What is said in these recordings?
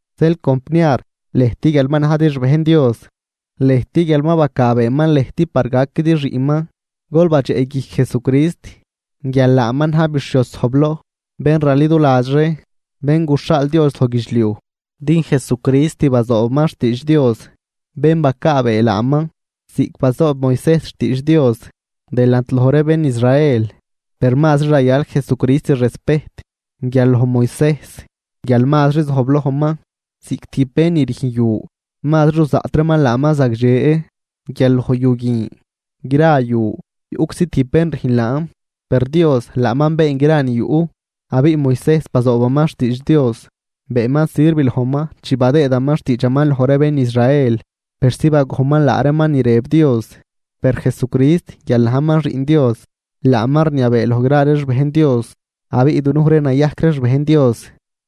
Zeel compniar, lëjt guial ma najdi xbejn Dios, lëjt guial ma bacaabeeman lëjt par gaquidi xiꞌnman, gol badxeꞌguijc Jesucrist guial laaman na̱j bixhioz zojbloj, bén raliduladx ree, bén guxhaal Dios loj guidxliuj. Din Jesucrist bazoobaman xtiidx Dios bén bacaabee laaman ziꞌc bazoob Moisejs xtiidx Dios delant loj ree bén Israel. Per mazri rayal Jesucrist respejt guial loj Moisejs guial mazri zojblojman, ziꞌc tijb bén ni rüjn yu mazri ruzaꞌt reeman laaman zagdxe guial loj yu guin. Gra yu yuꞌczi tijb bén rüjn laan, per Dios laaman been gra ni yuꞌ. Abiꞌ Moisejs bazoobaman xtiidx Dios, beenman sirv lojman chi badëëdaman xtiidxaman loj ree bén Israel persi bagojnman laa reeman ni rëb Dios. Per Jesucrist guial najman Xiꞌn Dios, laaman rniabee loj gra ree xbejn Dios. Abiꞌ dunuj ree nayajc ree xbejn Dios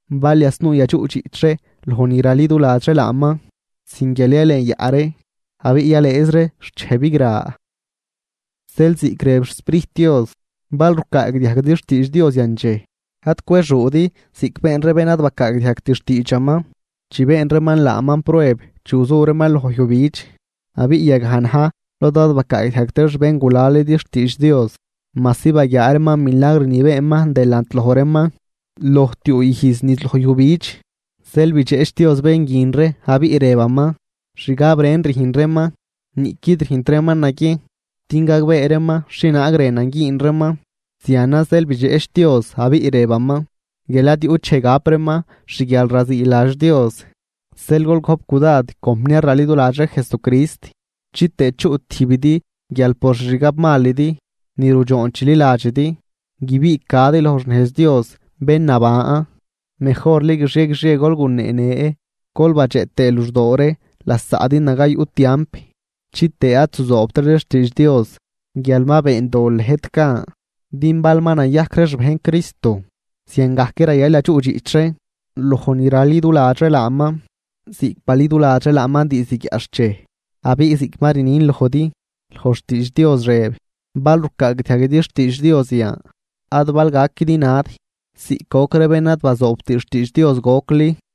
bal yasnuu yadxuꞌdxiꞌch ree loj ni raliduladx ree laaman sin guial yalenyaꞌ ree abiꞌ yalëëz ree xt dxej bigra. Zeel, ziꞌc rëb xSprijt Dios: Bal rucaagdiajguidi xtiidx Dios yan dxej, ad cwexuudi ziꞌc been ree bén ad bacaagdiajgt xtiidxaman chi been reeman laaman prueb chi guzu reeman loj yujbidx. Abiꞌ yagaj na̱j lod ad bacaagdiajgt ree xbéngulalidi xtiidx Dios majsi baguiaa reeman milagr ni beenman delant loj reeman loj tiuu ijz niz loj yujbidx. Zeel bidxeꞌch Dios bén guin ree, abiꞌ rëbaman: “Xgab ren rüjn reeman, niꞌquid rüjnt reeman naguiejn din gagbee reeman xhienaag rënan güün reeman.” Zianan zeel bidxeꞌch Dios abiꞌ rëbaman guial ad yuꞌt dxej gap reeman xguialraziiladx Dios. Zeel gol gojp cudad compniar raliduladx ree Jesucrist, chitëë chuꞌ tijbidi guial por xixgab malidi ni rudxoon chililadxidi, guibiꞌcadi loj xnejz Dios bén naban. Mejorli guixie guixie gol guneenë gol badxeꞌ tëë luxdoo ree lasaꞌdi naga yuꞌ tiamp, chitëë ad zuzoobtridi xtiidx Dios guial ma been dol lëjt gan. Din bal ma nayajc ree xbejn Cristo, zianczi rayal yadxuꞌdxiꞌch ree loj ni raliduladx ree laaman ziꞌc baliduladx ree laaman diizd guiaꞌxchej. Abiꞌ ziꞌc ma rnin lojdi, loj xtiidx Dios rëb: Bal rucaagdiajguidi xtiidx Dios yan, ad bal gaquidi nad ziꞌc goc ree bén ad bazoobt xtiidx Dios gocli.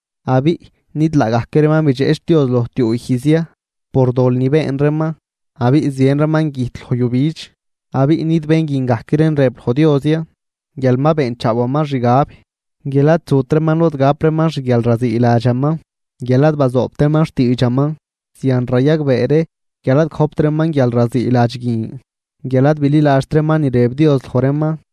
Abiꞌ, ¿nid laagajc reeman bidxeꞌch Dios loj tiuu ijz ya por dol ni been reeman abiꞌ zien reeman güjt loj yujbidx? Abiꞌ, ¿nid bén guin gajc reen rëb Dios loj ya guial ma beenchaawaman xgab guial ad zut reeman lod gap reeman xguialraziiladxaman, guial ad bazoobt reeman xtiidxaman? Zian rayagbee ree guial ad gojpt reeman guialraziiladx guin guial ad bililadxt reeman ni rëb Dios loj reeman.